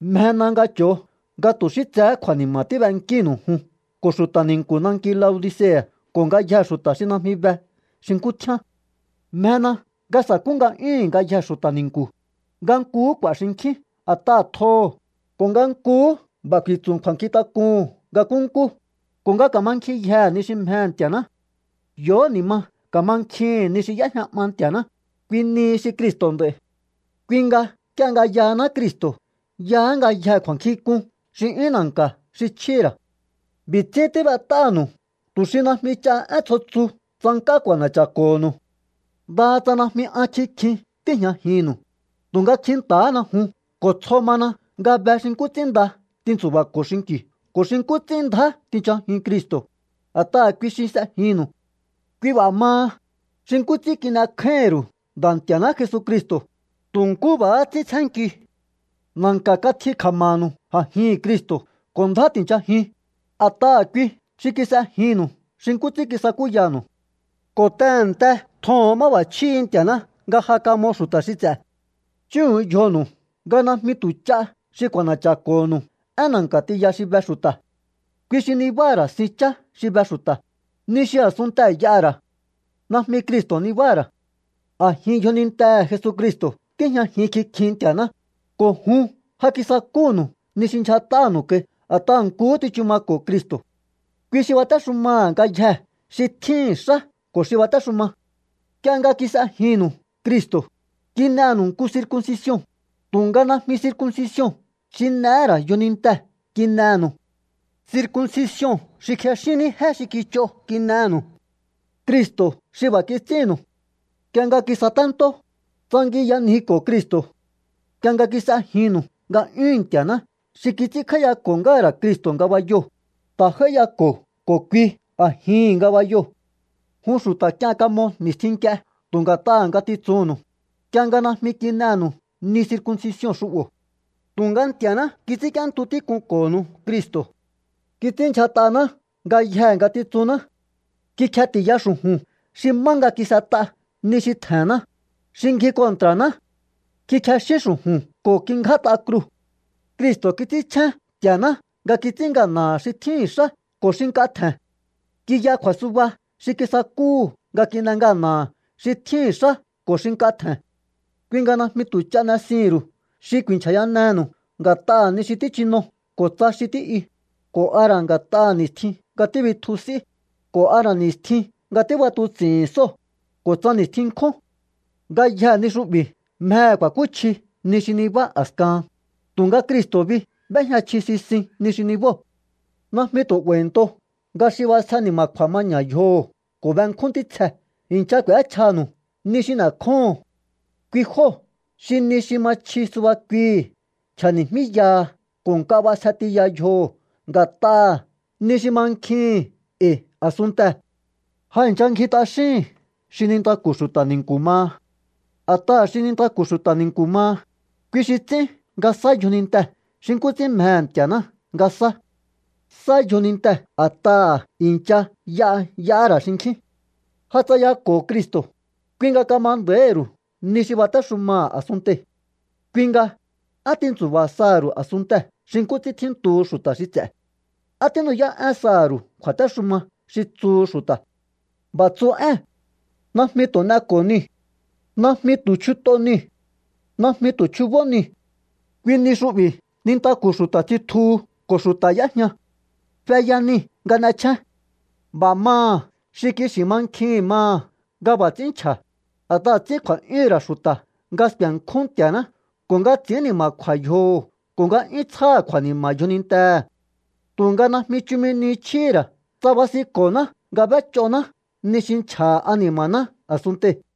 Mjena nga cho̱o nga tu̱ xí tsehé kju̱a̱ni̱ma̱ tíbenkínu̱u jun ko̱ xu̱ta̱ ni̱nku̱ nanki Laodicea̱ ko̱ ngayjee̱ xu̱ta̱ xi najmi be xi nkú tjíán. Mjena nga sa̱kú nga'yúhu̱n ngayjee̱ xu̱ta̱ ni̱nku̱, nga nkuhú k'u̱a̱ xinkjín a̱t'aha̱ tjoho̱, ko̱ nga nkuhú b'a̱ ku̱i̱tsu̱ kju̱a̱nkjintak'uhu̱n nga nkúnkú, ko̱ nga ka̱mankjinyjehe̱ ni xi mjehe̱ Nti̱a̱ná. Yo̱hó ni̱ ma ka̱mankjihi̱n ni xi y'éjña 'ma Nti̱a̱ná, kui nihi xi Cristo̱ nd'a̱i̱. Kui nga nk'ie nga yahaná Cristo̱ yaá ngayjee̱ kju̱a̱nkjink'un xi 'yún na̱nka̱ xi chjíhi̱ ra̱. B'i̱ ts'ín tíb'et'ánu̱u tu̱ xi najmi ch'a én tsjo tsu tsank'á k'u̱a̱na̱cha̱ko̱ho̱nu̱u. Ndaha tsa najmi an kikjin tíi̱jñajinnu̱u, tu̱nga kjinta̱hána jun ko̱ tsjo mana nga be xi nkú ts'ín nda tintsu̱ba̱ko̱o xinki̱u ko̱ xi nkú ts'ín ndjá tinchajiun Cristo̱, a̱t'aha̱ kui xi s'ejinnu̱u. Kui b'a̱ maha, xi nkú ts'ín kin'ekjáíhi̱n ru̱u Nda̱ Nti̱a̱ná Jesucristo̱, tu̱ nkú b'a̱há ts'ín tsjénkiu. Na̱nka̱ katji kja̱ma̱nu̱u a̱jihi̱n Cristo̱ ko̱ ndjá ti̱nchajiun, a̱t'aha̱ kui xi kis'ejinnu̱u xi nkú ts'ín kisakúyanu̱u. Ko̱ tehe̱nte tjoho̱on máb'a̱chjíhi̱ Nti̱a̱ná nga ja kamo xu̱ta̱ xi ts'e̱. Chúhu̱un yjonu̱u nga najmi tu̱ ch'a xi k'u̱a̱na̱cha̱ko̱ho̱nu̱u én na̱nka̱ tiya xi be xu̱ta̱. Kui xi nibáha̱ ra̱ sin chá xi be xu̱ta̱, ni xi a̱sunnte y'aha̱ ra̱. Najmi Cristo̱ nibáha̱ ra̱. A̱jin yjonintehe̱ Jesucristo̱ tíjñajin kikjin Nti̱a̱ná, ko̱ jun ja kisakúnu̱u ni xi ndyjat'anu̱u kai a̱t'aha̱ nkuhú tsichu mako̱o Cristo̱. Kui xi batéxumaha̱ ngayjee̱ xi tjíhi̱n xá ko̱ xi batéxuma. Nk'ie nga kis'ejinnu̱u Cristo̱, kin'enu̱u nku circuncision, tu̱nga najmi circuncision xi n'ehé ra̱ yjonintee̱ kin'enu̱u. Circuncision xi kjexín ní jé xi kich'o kin'enu̱u. Cristo̱ xi b'a̱ kits'ínnu̱u. Nk'ie nga kisatentó, tsangiyanjiko̱o Cristo̱. Nk'ie nga kis'ejinnu̱u nga'yúhu̱n Nti̱a̱ná xi kits'ínkj'áíyako̱ ngáha̱ ra̱ Cristo̱ ngabayoo̱, ta̱ j'áíyako̱o ko̱ kui a̱jihi̱n ngabayoo̱. Jun xu̱ta̱ k'ien kamo ni̱stjin nk'ie tu̱ nga̱t'aha̱ ngatitsunnu̱u, nk'ie nga najmi kin'enu̱u ni circuncision xu'bo̱. Tu̱nga Nti̱a̱ná kits'ínk'íéntu tík'unko̱nu̱u Cristo̱. Kits'ínndyjat'aná ngayjee̱ ngatitsunná. Kikjeti̱ya xu̱ju̱n xi má nga kis'et'a ni xi tje̱nná, xi ngji kontra̱ná. Kikjexín xu̱ju̱n ko̱ kingját'a kruu̱. Cristo̱ kits'ínchjén Nti̱a̱ná nga kits'ín ngana̱ha̱ xi tjíhi̱n xá ko̱ xi nk'a tje̱n. Kiya kju̱a̱suba xi kisakúhu̱ nga kin'e ngana̱ha̱ xi tjíhi̱n xá ko̱ xi nk'a tje̱n. Kui nga najmi tu̱ ch'a n'esihi̱n ru̱u xi ku̱i̱nchja̱yanenu̱u nga̱t'aha̱ ni xi tíchino ko̱ tsa xi tí'yu, ko̱ a ra̱ nga̱t'aha̱ ni̱stjin nga tíbitju s'í, ko̱ a ra̱ ni̱stjin nga tíb'atuts'i̱hi̱n sóo̱, ko̱ tsa ni̱stjin nkjún. Ngayjee̱ ni xu'bi̱ mjehe̱ ku̱a̱kúchji ni xi nibá a̱skahan, tu̱nga Cristo̱ bi b'éjña chji sisin ni xi nibóo̱. Najmi tu̱ 'ba̱i̱nto nga xi b'asje ni̱ma̱kju̱a̱ maña̱ yjoho̱ ko̱ benkjún ntítsjee̱ i̱ncha k'u̱échjanu̱u ni xi n'e̱kjóho̱on. Kui jóo̱ xi ni xi ma chji suba kuihi̱ nchja̱ni̱míyaha ko̱ nk'a b'asje tiya yjoho̱ nga̱t'aha̱ ni xi mankjihi̱n e̱i̱ a̱sunntee̱. Ja i̱ncha ngji t'axíhi̱n xi nintaku̱ xu̱ta̱ ni̱nku̱ maha. A̱t'aha̱ xi nintaku̱ xu̱ta̱ ni̱nku̱ maha, kui xi ts'ín nga sá yjonintee̱ xi nkú ts'ín mjehe̱ Nti̱a̱ná nga sá. Sá yjonintee̱ a̱t'aha̱ i̱ncha y'a y'ahá ra̱ xinkjín. Ja tsayako̱o Cristo̱, kui nga kama nda̱íhi̱ ru̱u ni xi batéxumaha̱ a̱sunntei̱. Kui nga, ¿á tintsu̱ba̱ saha̱ ru̱u a̱sunntee̱ xi nkú ts'ín tjíntuhu xu̱ta̱ xi ts'e̱? ¿Á tínu'yá'én saha̱ ru̱u kju̱a̱téxuma xi tsuhu xu̱ta̱? B'a̱ tsu ée̱n: “Najmi tu̱ n'eko̱o niu̱. Najmi tu̱ chjut'o niu̱. Najmi tu̱ chjubó niu̱.” Kui ni xu'bi̱ nintaku̱ xu̱ta̱ tsitjuhu ko̱ xu̱ta̱ y'éjña. Feya nii̱ nga n'echjén. B'a̱ maha̱ xi kixi̱ mankjihi̱n maha̱ nga b'a̱ ts'ín nchja̱, a̱t'aha̱ ts'ín kju̱a̱'yúhu̱n ra̱ xu̱ta̱ nga sku̱e̱nkjún Nti̱a̱ná ko̱ nga ts'i̱ín ni̱ma̱kju̱a̱ yjoho̱ ko̱ nga 'yún tsjáha̱ kju̱a̱ni̱ma̱ yjonintehe̱. Tu̱nga najmi chumi ni chjíhi̱ ra̱ tsa basinko̱ná nga b'éch'oná ni xi nchja̱ha̱ ani̱ma̱ná a̱sunntei̱.